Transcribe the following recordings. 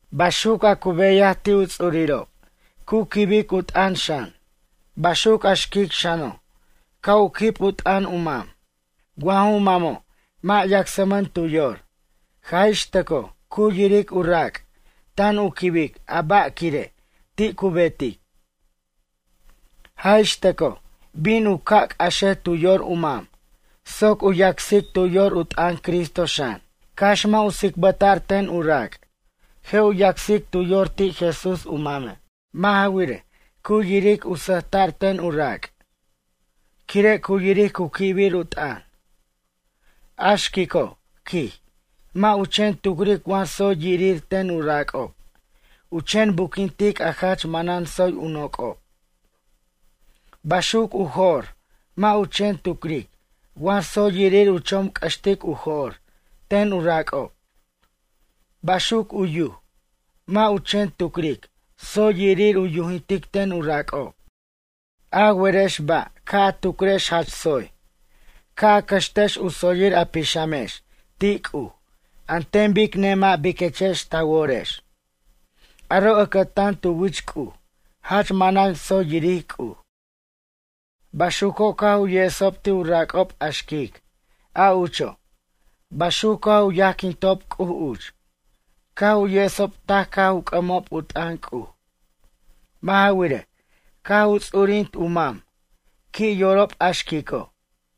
Baxuc a cu beyaj ti' u ts'urirob cu quibic u t'ʌn xan. Baxuc a xquic xano', ca' u quib u t'ʌn u mam. Wa ju mamo' mʌ' yacsmʌno' tu yor, jaj ix tʌcoj cu yiric u rac' tan u quibic a ba' quire' ti' cu betic. Jaj ix tʌcoj, bin u ca' c'axej tu yor u mam soc u yacsic tu yor u t'ʌn Cristo xan. Cax mʌ' u tsicbʌta'r ten u rac'. Je' u yacsic tu yor ti' Jesús u mame'. Mʌ' ja wirej, cu yiric u sʌjta'r ten u rac'. Quire' cu yiric cu quibir u t'ʌn. A xquico', quij, mʌ' u chen tucric wa tsoy yirir ten u rac'ob, u chen buquintic a jach manan tsoy u noc'ob. Baxuc u jo'r, mʌ' u chen tucric wa tsoy yirir u chomc'ʌxtic u jo'r ten u rac'ob. Baxuc u yuj, mʌ' u chen tucric tsoy yirir u yujintic ten u rac'ob. A werex ba' ca' a tucrex jach tsoy? Ca' a cʌxtex u tsoyir a pixamanex ti' C'uj an ten bic nemʌ' biquechex ta worex, aro' ʌcʌtan tu wich C'uj jach manan tsoy yiric C'uj. Baxuco' caj u yesob ti' u rac'ob a xquic, a ucho'. Baxuc caj u yajquintob C'uj uch. Caj u yesob taj caj u c'ʌmob u t'ʌn C'uj. Mʌ' ja wirej, caj u ts'urint u mam, qui' yorob a xquico'.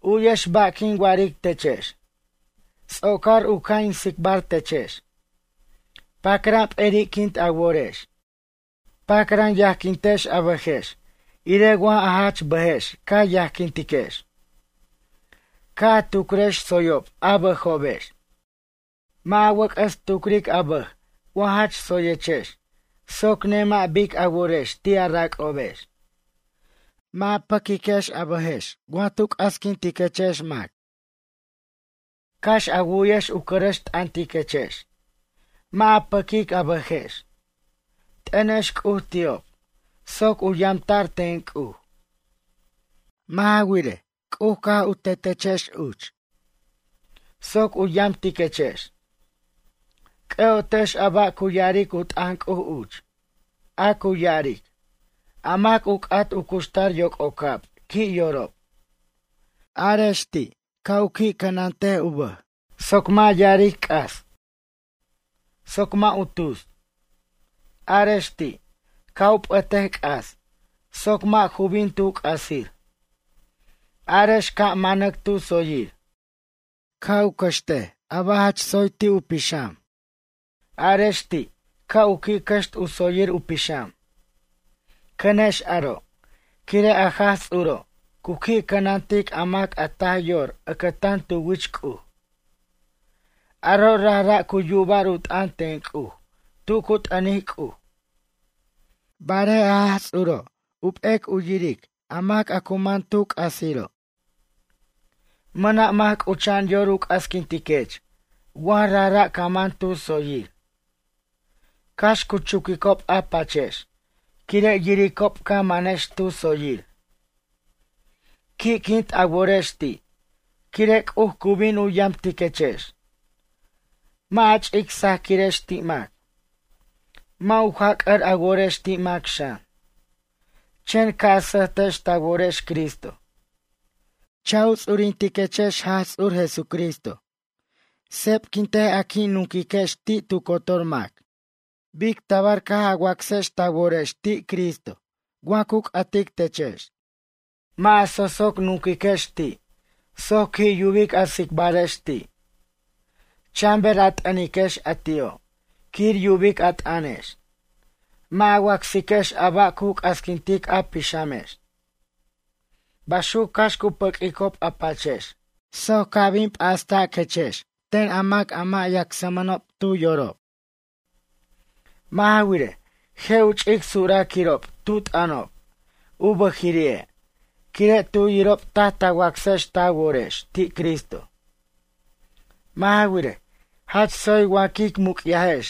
U'yex ba' quin wa'aric techex. Ts'ocar u ca' in tsicbar techex. Pacran p'eri'quint a worex. Pacran yajquintex a bʌjex irej wa a jach bʌjex ca yajquintiquex. Ca' a tucrex tsoyob a bʌjobex. Mʌ' a wʌc'ʌs tucric a bʌj wa jach tsoyechex soc nemʌ' bic a worex ti' a rac'obex. Mʌ' a pʌquiquex a bʌjex wa tu c'asquintiquechex mac. Cax a wu'yex u cʌrʌx t'ʌntiquechex. Mʌ' a pʌquic a bʌjex. T'ʌnex C'uj ti'ob, soc u yamta'r ten C'uj. Mʌ' ja wirej, C'uj caj tetechex uch, soc u yamtiquechex. C'ʌ'otex a ba' cu ya'aric u t'ʌn C'uj uch. A cu ya'aric: A mac u c'at u cuxtar yoc'ocab qui' yorob. Arex ti', ca' u qui' cʌnant u bʌj, soc mʌ' ya'aric c'as, soc mʌ' tus. Arex ti', ca' u p'ʌtej c'as soc mʌ' ju bin tu c'asir. Arex ca' manac tu tsoyir. Ca' u cʌxt a ba' jach tsoy ti' u pixam. Arex ti' ca' u qui' cʌxt u tsoyir u pixam. Cʌnex aro', quire' a Jaj Ts'uro', cu qui' cʌnantic a mac a taj yor ʌctan tu wich C'uj. Aro' rajra' cu yuba'r u t'ʌn ten C'uj tu cu t'ʌnic C'uj. Barej a Jaj Ts'uro', p'ec u yiric a mac a cu man tu c'asiro'. Mʌna' mac c'ucha'an yor u c'asquintiquech wa rajra' ca man tu tsoyir. Cax cu chuquicob a pachex quire' yiricob ca manex tu tsoyir. Qui'quint a worex ti' quire' C'uj cu bin yamtiquechex. Mʌ' a ch'ic sajaquirex ti' mac. Mʌ' u jac'ʌr a worex ti' mac xan. Chen ca' a sʌjtex ta worex Cristo. Cha' a ts'urintiquex Jaj Ts'ur Jesucristo. Sepquint a qui' nunquexi' tu cotor mac, bic tabar caj a wacsex ti' Cristo ta worex wa cu c'atic techex. Mʌ' a so'soc nunquex ti' soc qui' yubic a tsicbarex ti'. Chan ber a t'ʌniquex a ti'o' quir yubic a t'ʌnex. Mʌ' a wacsiquex a ba' cu c'asquintic a pixamex. Baxuc cax cu pʌq'uicob a pachex soc ca' bin p'astiquechex ten a mac a mʌ' yacsmʌnob tu yorob. Mʌ' ja wirej, je' u ch'ic suraquirob tu t'ʌnob u bʌjiri'e' quire' tu yirob taj ta wacsex ta worex ti' Cristo. Mʌ' ja wirej, jach tsoy wa quic muc'yajex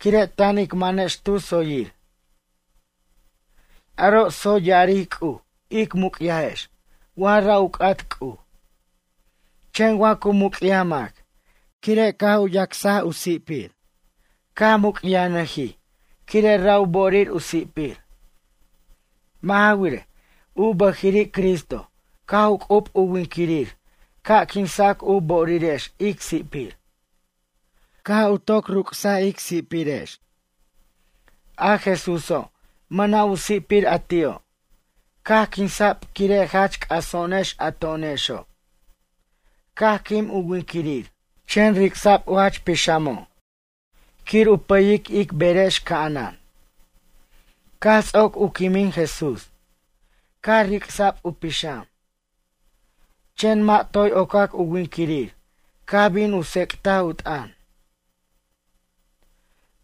quire' tan ic manex tu tsoyir. Aro' tsoy ya'aric C'uj ic muc'yajex wa ra' u c'at C'uj. Chen wa cu muc'yaj mac, quire' caj u yacs u si'pir. Caj muc'yajnʌjij quire' ra' u bo'orir u si'pir. Mʌ' ja wirej, u bʌjiri' Cristo caj u c'ub u winquirir ca' quinsa'c u bo'orirex ic si'pir. Caj u toc ruc's ic si'pirex. A Jesúso' mʌna' u si'pir a ti'o', caj quinsa'b quire' jach c'aso'onex a to'onexo'. Caj quim u winquirir, chen ric'sa'b u jach pixamo' quir u pʌyic ic berex ca'anan. Caj ts'oc u quimin Jesús, caj ric'sa'b u pixam. Chen mʌ' toy ocac u winquirir caj bin u tsec'taj u t'ʌn.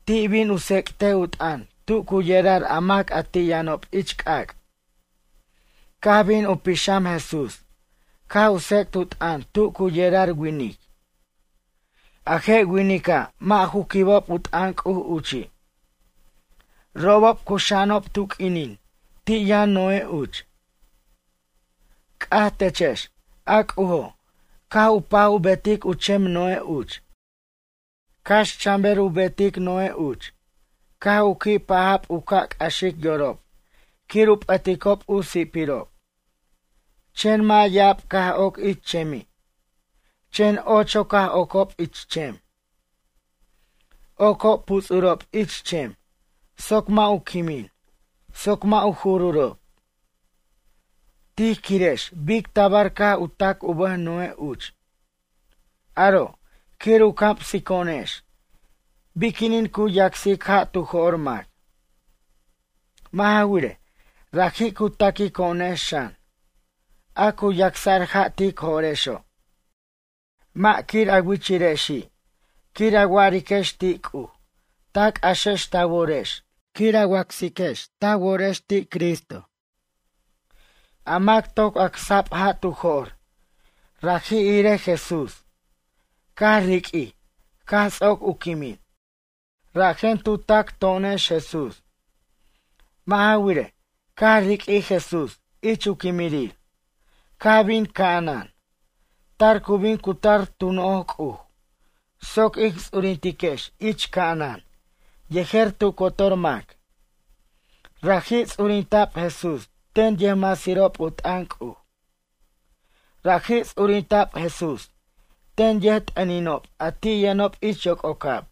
Ti' bin u tsec'tej u t'ʌn tu cu yerar a mac a ti' yʌnob ich c'ac'. Caj bin u pixam Jesús caj u tsec't u t'ʌn tu cu yerar winic. A je' winica' mʌ' ju quibob u t'ʌn C'uj uchi'. Robob cuxa'anob tu q'uinin ti' yʌn Noé uch. C'aj techex, a C'ujo', caj u paj u betic u chem Noé uch. Cax chan ber u betic Noé uch, caj u qui' paja'b u ca' c'axic yorob quir u p'ʌticob u si'pirob. Chen mʌ' ya'ab caj oc ich chemi'. Chen ocho caj ocob ich chem. Ocob puts'urob ich chem, soc mʌ' u quimin soc mʌ' u jururob. Tij quirex bic tabar caj u tac u bʌj Noé uch. Aro', quir u camsico'onex biquinin cu yacsic ja' tu jo'r mac. Mʌ' ja wirej, raji' cu taquico'onex xan, a cu yacsa'r ja' tic jo'rexo'. Mʌ' quir a wichirexi' quir a wa'ariquex ti' C'uj ta c'axex ta worex quir a wacsex ta worex ti' Cristo. A mac toc acsa'b ja' tu jo'r raji' irej Jesús caj riq'uij caj ts'oc u quimin. Rajen tu tac to'onex Jesús. Mʌ' ja wirej, caj riq'uij Jesús ich u quimirir, caj bin ca'anan. Tar cu bin cutar tu noj C'uj, soc ic ts'urintiquex ich ca'anan yejer tu cotor mac. Raji' ts'urinta'b Jesús ten yʌjmasirob u t'ʌn C'uj. Raji' ts'urinta'b Jesús ten yʌjt'ʌninob a ti' yʌnob ich yoc'ocab.